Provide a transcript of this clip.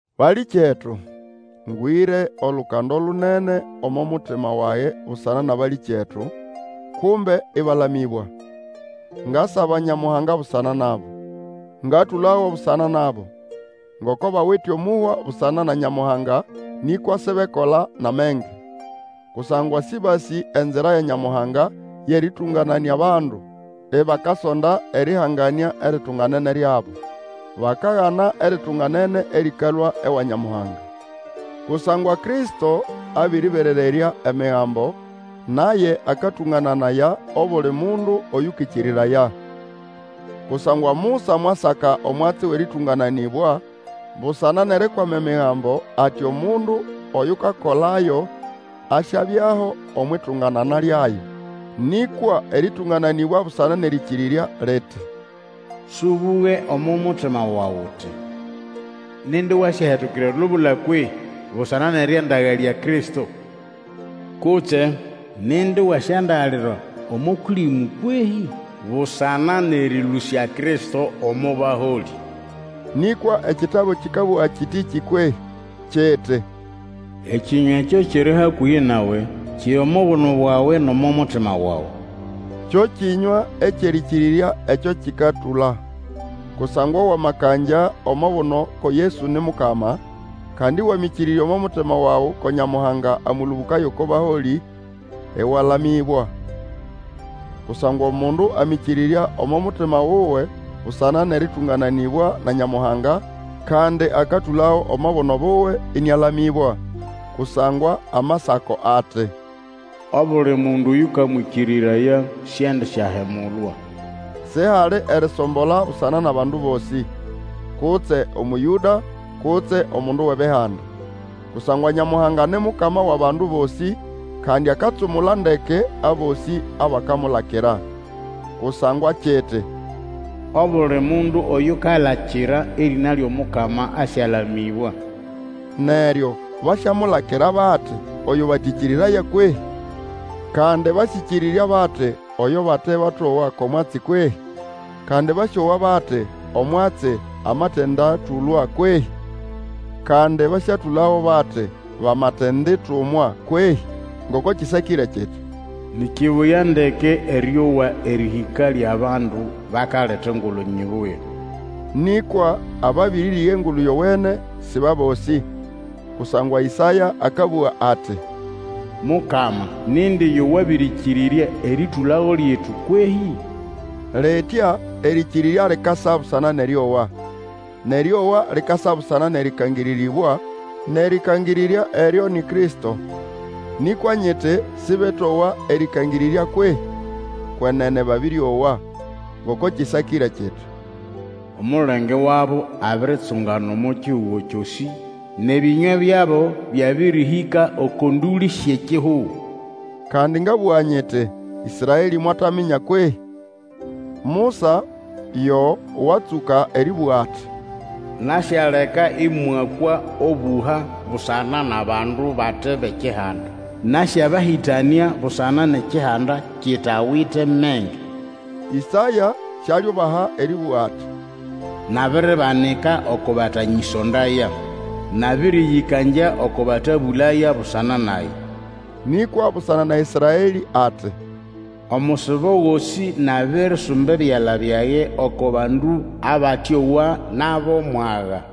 Balĩkyetu, ngwĩre olukando lunene omo mutima wage busana nʼabalĩkyetu, kumbe ĩbalamĩbwa. Ngasaba Nyamuhanga busana nabo. Ngatũlago busana nabo, ngoko bawite omũhwa busana na Nyamuhanga, nĩkwa sibekola nʼamenge. Kusangwa sĩbasĩ enzira ya Nyamuhanga yʼerĩtũngananĩa abandu, ibakasonda erĩhanganĩa eritunganene ryabo. Bakagana eritunganene erĩkalũa ewa Nyamuhanga. Kusangwa Kristo abĩrĩberererya Emigambo, naye akatũngananaya obuli mundu Oyũkĩkĩrĩraya. Kusangwa Musa mwasaka omwatsi wʼerĩtũngananĩbwa busana nʼerikwama Emigambo ati omundu oyukakolayo asyabyaho omwʼitunganana lyayo. Nĩkwa erĩtũngananĩbwa busana nʼerĩkĩrĩrya liti, Sũbũge omo mutima wawe uti, Nindi wasyahetukira elubula kwehĩ? busana nʼerĩandagalya Kristo. Kutse, Nindi wasyandagalira omo Kũlĩmũ kwehĩ? busana nʼerĩlũsya Kristo omo baholĩ. Nĩkwa ekitabu kĩkabũga kĩtĩkĩ kwehĩ? kiti, Ekĩnywa ekyo kiri hakũhĩ nawe, kiri omo buno bwawe nʼomo mutima wawe, kyo kĩnywa kyʼerĩkĩrĩrya ekyo tũkatũla. Kusangwa wamakangya omo buno ko Yesu ni Mukama, kandi Wamĩkĩrĩrya omo mutima wawe ko Nyamuhanga amũlũbũkaya oko baholĩ, ĩwalamĩbwa. Kusangwa omundu amĩkĩrĩrya omo mutima wuwe busana nʼerĩtũngananĩbwa na Nyamuhanga, kandi akatũlago omo buno buwe, ĩnĩalamĩbwa. Kusangwa Amasako ati, Obuli mundu oyũkamwĩkĩrĩraya siendisyahemulwa. Sihali erisombola busana nʼabandu bosĩ, kutse Omũyũda, kutse omundu wʼEbihanda. Kusangwa Nyamuhanga ni Mukama wʼabandu bosĩ, kandi akatsumula ndeke abosĩ abakamulakira. Kusangwa kiti, Obuli mundu oyukalakira erĩna lyʼomukama asyalamĩbwa. Neryo basyamulakira bati, oyo batĩkĩrĩraya kwehĩ? Kandi basĩkĩrĩrya bati oyo bate batowa ko mwatsi kwehĩ? Kandi basyowa bati, omwatsi amatĩndatũlwa kwehĩ? Kandi basyatũlago bati, bamatenditumwa kwehĩ? Ngoko kĩsakĩre kiti, Ni kibuya ndeke erĩowa erĩhĩka lyʼabandu bakaleta engulu nyibuya. Nĩkwa ababĩrĩrĩga Engulu Yowene sĩ bʼabosĩ; kusangwa Ĩsaya akabũga ati, Mukama, nindi yo wabĩrĩkĩrĩrya erĩtũlago lyetu kwehĩ? Litya erĩkĩrĩrya likasa busana nʼerĩowa, nʼerĩowa, likasa busana nʼerĩkangĩrĩrĩbwa, nʼerĩkangĩrĩrya eryo ni Kristo. Nĩkwa nyiti sĩbetowa erĩkangĩrĩrya kwehĩ? Kwenene babĩrĩowa. Ngoko kĩsakĩre kiti, Omulenge wabo abiritsungana omo kihugo kyosĩ, Nʼebĩnywa byabo byabĩrĩhĩka oko ndũlĩ syʼekihugo. Kandi ngabũga nyiti, Ĩsraelĩ mwataminya kwehĩ? Musa yo watsũka erĩbũga ati, Nasyaleka ĩmwakwa obũha busana nʼabandu bate bʼekihanda, Nasyabahĩtanĩa busana nʼekihanda kitawite menge. Ĩsaya sialiubaha erĩbũga ati, Nabiribanika oko batanyĩsondaya, Nabĩrĩyĩkangya oko batabũlaya busana nage, Nĩkwa busana na Ĩsraelĩ ati, Omusibo gosĩ nabirisumba ebyala byage oko bandu abatĩowa nʼabʼomwaga.